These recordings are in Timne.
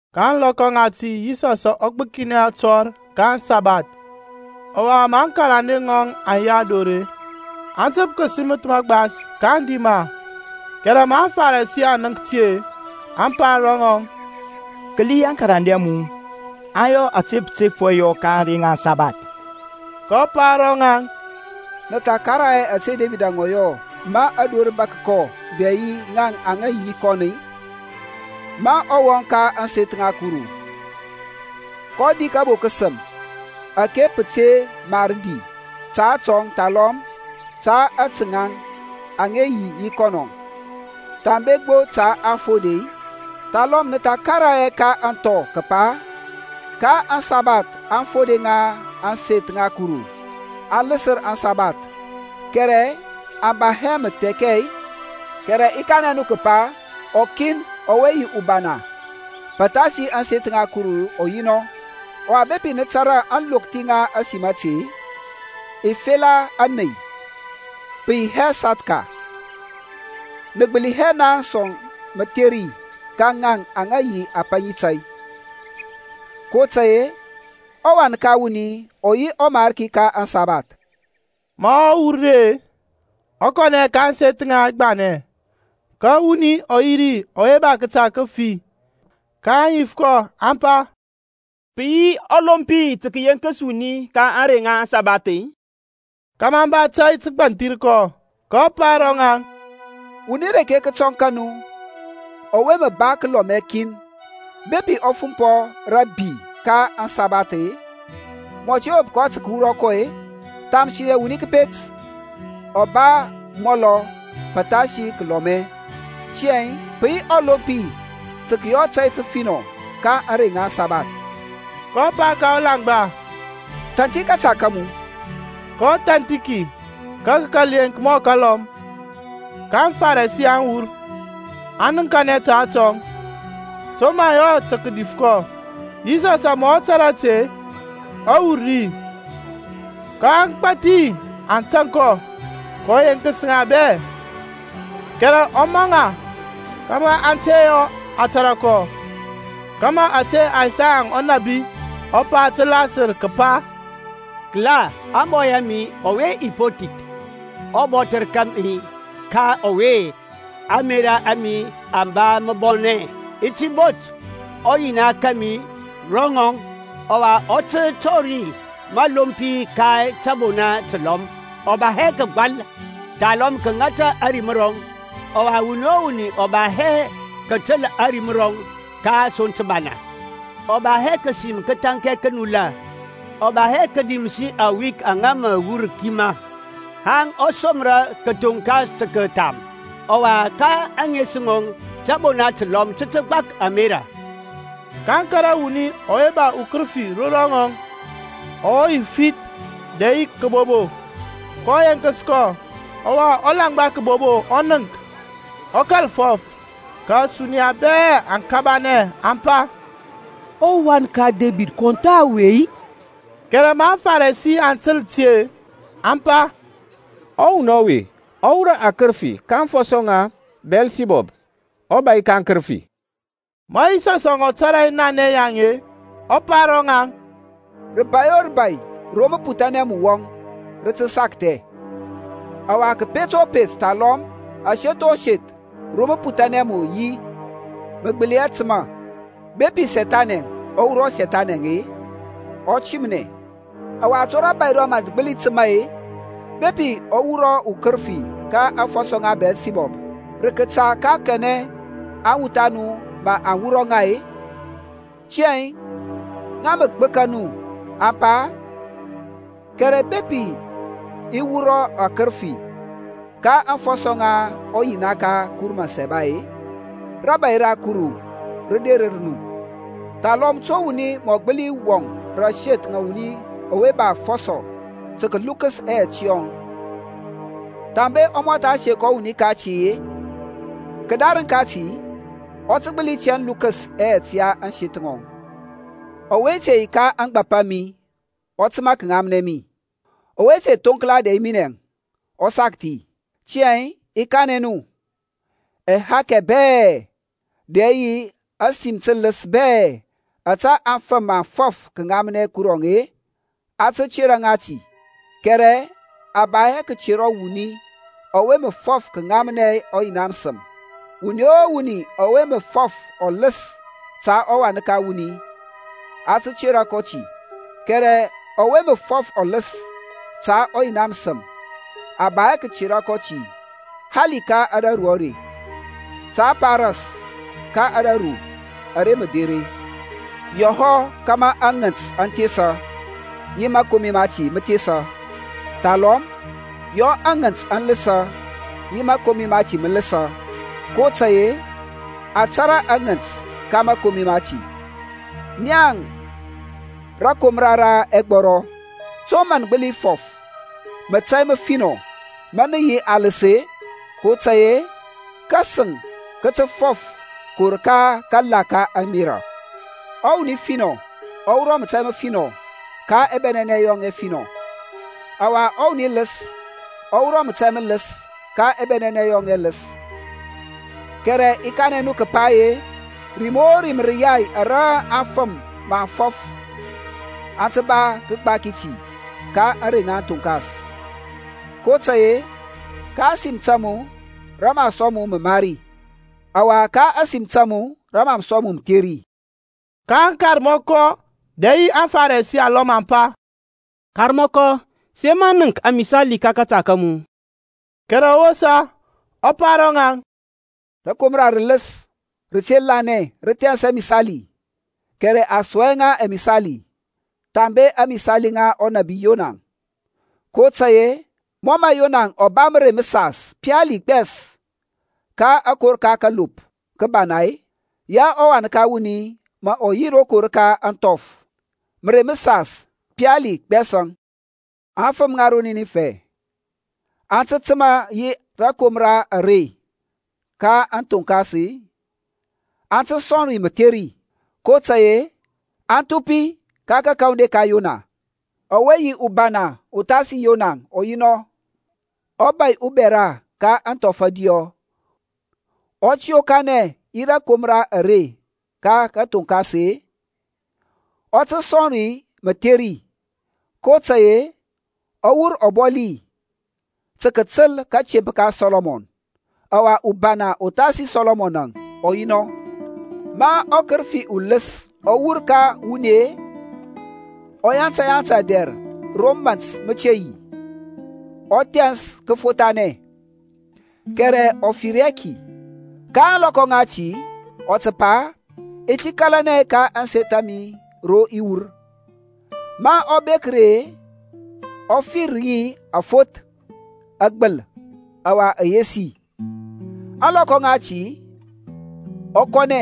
Ka ȧŋlɔkɔ ŋati Yisɔsȧŋ ɔ gbǝkinɛ atɔr ka aŋsabath. Ɔwa ma aŋkarande ŋɔŋ aŋ yi ador-e, aŋ tǝp kǝsimǝth magbas, kaŋ di ma. Kɛrɛ ma aŋFarisi aŋ nənk ti-e, aŋ pa ro ŋɔŋ, Kǝli aŋkarande a mu aŋ yɔ ȧte pǝ te mar yɔ ka ȧŋrey ŋa aŋsabath. kɔ pa ro ŋaŋ, Nǝ tha karaŋ hɛ ȧte Debid ɔ yɔ ma dor rǝ bȧk kɔ dɛ yi ŋaŋ aŋa yi yi kɔn-i? Ma ɔ wɔŋ ka ȧŋseth ŋa Kuru, kɔ di kabo kǝsǝm ȧke pǝ te mar di ta atɔŋ thalɔm ta ȧte ŋaŋ aŋa yi yi kɔnɔ, thambe gbo ta aŋfode-i? Thalɔm nǝ tha karaŋ hɛ ka aŋthɔ kǝpa ka aŋsabath aŋfode ŋa ȧŋseth ŋa Kuru aŋ lǝsǝr aŋsabath, kɛrɛ aŋ ba hɛ mǝthɛkɛ-i? Kɛrɛ i kanɛ nu kǝpa, ukin ɔwe yi ubana pǝthasi ȧŋseth ŋa Kuru ɔ yi nɔ. Ɔwa bepi nǝ tȧrȧ naŋ aŋlokthi ŋa ȧsim ȧte, I fela ȧney, pǝ yi hɛ sathka, nǝ gbǝli hɛ naŋ sɔŋ mǝtheri ka ŋaŋ aŋa yi apaŋi tȧy. kotȧy-e ɔWan ka wuni ɔ yi ɔMarki ka aŋsabath. Ma ɔ wur ri-e, ɔ kɔnɛ ka ȧŋseth ŋaŋ agbanɛ. Ka wuni ɔ yi ri ɔwe ba kǝta kǝfi. Kaŋ yif kɔ, aŋ pa, Pǝ yi ɔlompi tǝ kǝyeŋkǝs wuni ka ȧŋrey ŋa ȧŋsabath-i? (kȧmȧ aŋ ba tȧy tǝ kǝgbanthir kɔ). kɔ pa ro ŋaŋ, Wuni reke kǝtɔŋ ka nu ɔwe mǝ ba kǝlɔmɛ kin, bepi ɔ fumpɔ rǝ abi ka aŋsabath-e, mǝ ɔ te wop kɔ tǝ kǝwura kɔ-e? Thamsinɛ wuni kǝpet ɔ ba amɔlɔ pǝthasi kǝlɔmɛ! Tiyȧŋ pǝ yi ɔlompi tǝ kǝyɔ tȧy tǝfinɔ ka ȧŋrey ŋa aŋsabath. kɔ pa ka ɔlaŋgba, Thanthi kȧta ka mu. Kɔ thanthi ki, ka kǝ kȧl yeŋk mɔ kalɔm. Ka aŋFarisi aŋ wur, aŋ nǝŋkanɛ ta atɔŋ, to mǝ aŋ yɔ tǝ kǝdif kɔ. Yisɔsȧŋ ma ɔ tȧrȧ ti-e, ɔ wur ri, ka agbȧthi aŋ tȧŋ kɔ, kɔ yeŋkǝs ŋa bɛ. Kɛrɛ ɔ maŋ ŋa kȧmȧ aŋ te yɔ a tȧrȧ kɔ, kȧmȧ ȧte Isaya ɔnȧbi ɔ pa tǝ lasǝr, kǝpa, Kǝla, ȧŋbɔy a mi ɔwe i po thith, Ɔbɔthǝr kȧmi ka ɔwe ȧŋmerȧ a mi aŋ ba mǝbɔnɛ. I ti bot ɔYina kȧmi ro ŋɔŋ, Ɔwa ɔ tǝ tɔri mǝlompi ka tȧbona tǝlɔm. Ɔ ba hɛ kǝgbȧl, thalɔm kǝŋȧtȧ ȧrim rɔŋ, Ɔwa wuni o wuni ɔ ba hɛ kǝtǝl ȧrim rɔŋ ka asoŋ tǝbana. Ɔ ba hɛ kǝsim kǝthȧnkɛ kǝnulȧ, Ɔ ba hɛ kǝdimsi awik aŋa mǝ wur kimȧ, Haŋ ɔ somrȧ kǝthoŋkas tǝ kǝtham. Ɔwa ka ȧŋes ŋɔŋ tȧbona tǝlɔm tǝ tǝ gbak ȧmerȧ. kaŋ kȧrȧ wuni ɔwe ba ukǝrǝfi ro ŋɔŋ, ɔ yi ufith dɛ yi kǝbobo. Kɔ yeŋkǝs kɔ, ɔwa ɔlaŋgba kǝbobo ɔ nənk, ɔ kȧl fɔf. Ka ȧsuniya bɛ aŋ kabanɛ, aŋ pa, ƆWan ka Debid, kɔn tha ɔwe-i? Kɛrɛ ma aŋFarisi aŋ tǝl ti-e, aŋ pa, Ɔwuni ɔwe ɔ wurɔ akǝrǝfi ka aŋfɔsɔ ŋa Biyɛlsibɔb, ɔbȧy ka aŋkǝrǝfi. Ma Yisɔsȧŋ ɔ tȧrȧ ɛnanɛ yaŋ-e, ɔ pa ro ŋaŋ, Rǝbai o rǝbai ro mǝputhanɛ mǝ wɔŋ rǝ tǝ sakthɛ; ɔwa kǝpet o kǝpet thalɔm aseth o seth ro mǝputhanɛ mǝ yi aŋ gbǝli hɛ tǝma. Bepi Sethani ɔ wurɔ Sethani-e, ɔ timnɛ, ɔwa to rȧbȧy rɔŋ mǝ rǝ gbǝli tǝma-e? Bepi i wurɔ akǝrǝfi ka aŋfɔsɔ ŋa Biyɛlsibɔbȧŋ, rǝ kȧta ka kanɛ aŋwuth a nu mǝ aŋ wurɔ ŋa-e? Tiyȧŋ ŋa mǝ gbǝka nu ȧŋpa. Kɛrɛ bepi i wurɔ akǝrǝfi ka aŋfɔsɔ ŋa ɔYina ka Kuru Mǝsaba-e, rȧbȧy ra Kuru rǝ derǝr nu. Thalɔm to wuni mǝ ɔ gbǝli wɔŋ rǝ ȧŋseth ŋa wuni ba afɔsɔ tǝ kǝlukǝs ɛyɛt yɔŋ thambe ɔ mɔtha sek ɔwuni kati-e? Kǝdarǝŋ kati ɔ tǝ gbǝli tɛn lukǝs ɛyɛt ya ȧŋseth ŋɔŋ. Ɔwe te yi ka ȧŋgbȧp a mi ɔ tǝma kǝŋamnɛ mi. Ɔwe te thoŋkla dɛ yi minɛȧŋ, ɔ sakthi. Tiyȧŋ i kanɛ nu, ɛhakɛ bɛ-e, dɛ yi ȧsim tǝlǝs bɛ ȧte afǝm mǝ aŋ fɔf kǝŋamnɛ Kuruȧŋ, a tǝ tera ŋa ti, kɛrɛ a ba hɛ kǝtera ɔwuni ɔwe mǝ fɔf kǝŋamnɛ ɔYina mǝsǝm. Wuni o wuni ɔwe mǝ fɔf ɔlǝs ta ɔWan ka wuni, a tǝ tera kɔ ti; kɛrɛ ɔwe mǝ fɔf ɔlǝs ta ɔYina mǝsǝm, a ba hɛ kǝtera kɔ ti hali ka ȧdȧru are, ta a pa ras ka ȧdȧru ara mǝ derȧŋ. Yɔ hɔ kȧmȧ aŋǝnt aŋ thesa, yi mȧkomi mati mǝ thesa, thalɔm yɔ aŋǝnt aŋ lǝsǝ yi mȧkomi mati mǝ lǝsǝ; kotȧy-e a tȧrȧ aŋǝnt ka mȧkomi mati. Naŋ rǝkomra ra ɛgbɔrɔ, to mǝ nǝ gbǝli fɔf mətȧy mǝfinɔ ma nǝ yi alǝs-e? kotȧy-e kasǝŋ kǝ tǝ fɔf kǝwur ka kala ka ȧŋmerȧ. Ɔwuni finɔ ɔ wurɔ mətȧy mǝfinɔ ka ɛbɛnɛnɛ yɔŋ ɛfinɔ, ɔwa ɔwuni lǝs ɔ wurɔ mətȧy mǝlɔs ka ɛbɛnɛnɛ yɔŋ ɛlǝs. Kɛrɛ i kanɛ nu kǝpa-e, rim o rim rǝyai ara afǝm mǝ aŋ fɔf aŋ ba tǝ kǝgbaki ti ka ȧŋrey ŋa kǝthoŋkas. kotȧy-e ka ȧsim ta mu rǝ mǝ a sɔŋ mu mǝmari, ɔwa ka ȧsim ta mu rǝ mǝ a sɔŋ mu mǝtheri. Ka aŋkarmɔkɔ dɛ yi aŋFarisi alɔm aŋ pa, Karmɔkɔ, sǝ yema nənk amisali ka kȧta ka mu. Kɛrɛ ɔ wosa ɔ pa ro ŋaŋ, Rǝkomra rǝlǝs, rǝte lanɛ rǝ thɛns amisali, kɛrɛ a sɔŋ hɛ ŋa amisali, thambe ȧŋmisali ŋa ɔnȧbi Yona. kotȧy-e mɔ mǝ Yonaȧŋ ɔ ba mǝrei mǝsas pali gbɛs ka akor ka kalop kǝbana-e, ya ɔWan ka wuni mǝ ɔ yi rokor ka ȧŋthɔf mǝrei mǝsas pali gbɛsȧŋ. Aŋfǝm ŋa ro Ninifɛ aŋ tǝ tǝma yi rȧkomra are ka kathoŋkas-e, aŋ tǝ sɔŋ ri mǝtheri, kotȧy-e aŋ thupi ka kakawandi ka Yona, ɔwe yi ubana uthasi Yonaȧŋ ɔ yi nɔ. Ɔbȧy ubɛra ka ȧŋthɔf ȧdiyɔ ɔ tǝ yokanɛ yi rȧkomra are ka kathoŋkas-e, ɔ tǝ sɔŋ ri mǝtheri, kotȧy-e ɔ wur ɔbɔli tǝ kǝtǝl kȧtemp ka Sɔlɔmɔn, ɔwe yi ubana uthasi Sɔlɔmɔn ɔ yi nɔ. Ma ɔkǝrǝfi ulǝs ɔ wur ka wuni-e, ɔ yanta yanta dɛr ro mȧnt mǝ te yi, ɔ thɛns kǝfothanɛ kɛrɛ ɔ fir hɛ ki. Ka ȧŋlɔkɔ ŋati ɔ tǝ pa, I ti kȧlanɛ ka ȧŋseth a mi ro i wur. Ma ɔ bek ri-e, ɔ fir ŋi afoth, agbǝl, ɔwa ayesi. Ȧŋlɔkɔ ŋati ɔ kɔnɛ,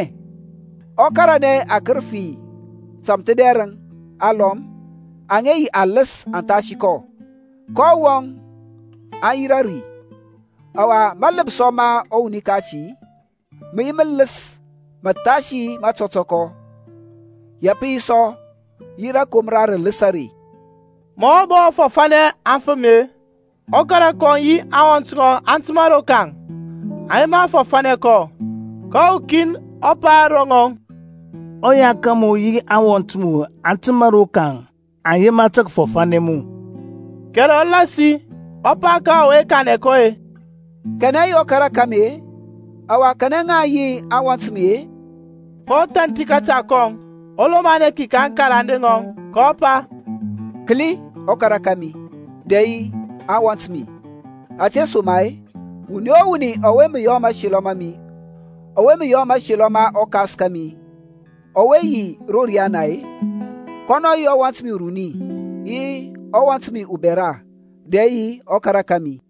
ɔ karanɛ akǝrǝfi tamthǝdɛrǝŋ alɔm aŋa yi alǝs athasi kɔ, kaŋ wɔŋ aŋ yirȧ ri. Ɔwa mȧlǝpsɔ ma ɔwuni kati mǝ yi mǝlǝs mǝthasi matɔtɔkɔ. Ya pǝ yi sɔ yi rȧkomra rǝlǝs are. Ma ɔ bɔ fɔfȧnɛ aŋfǝm-e, ɔkara kɔŋ yi aŋwɔnt ŋɔŋ aŋ tǝma rokaŋ, aŋ yema kǝ fɔfȧnɛ kɔ. Ka ukin ɔ pa ro ŋɔŋ, Ɔya ka mu yi aŋwɔnt mu aŋ tǝma rokaŋ, aŋ yema kǝfɔfanɛ mu. Kɛrɛ ɔ lasi, ɔ pa ka ɔwe kanɛ kɔ-e, Kanɛ yi ɔkara ka mi-e, ɔwa kanɛ ŋaŋ yi aŋwɔnt a mi-e? kɔ thanthi kȧta kɔŋ, ɔ lomanɛ ki ka aŋkarande ŋɔŋ, kɔ pa, Kǝli ɔkara kȧmi dɛ yi aŋwɔnt a mi! Ȧtesoma-e wuni o wuni ɔwe mǝ yɔ mȧselɔ ma ɔKas kȧmi ɔwe yi ro riana-e, kɔnɔ yi ɔwɔnt mi uruni yi ɔwɔnt mi ubɛra dɛ yi ɔkara kȧmi.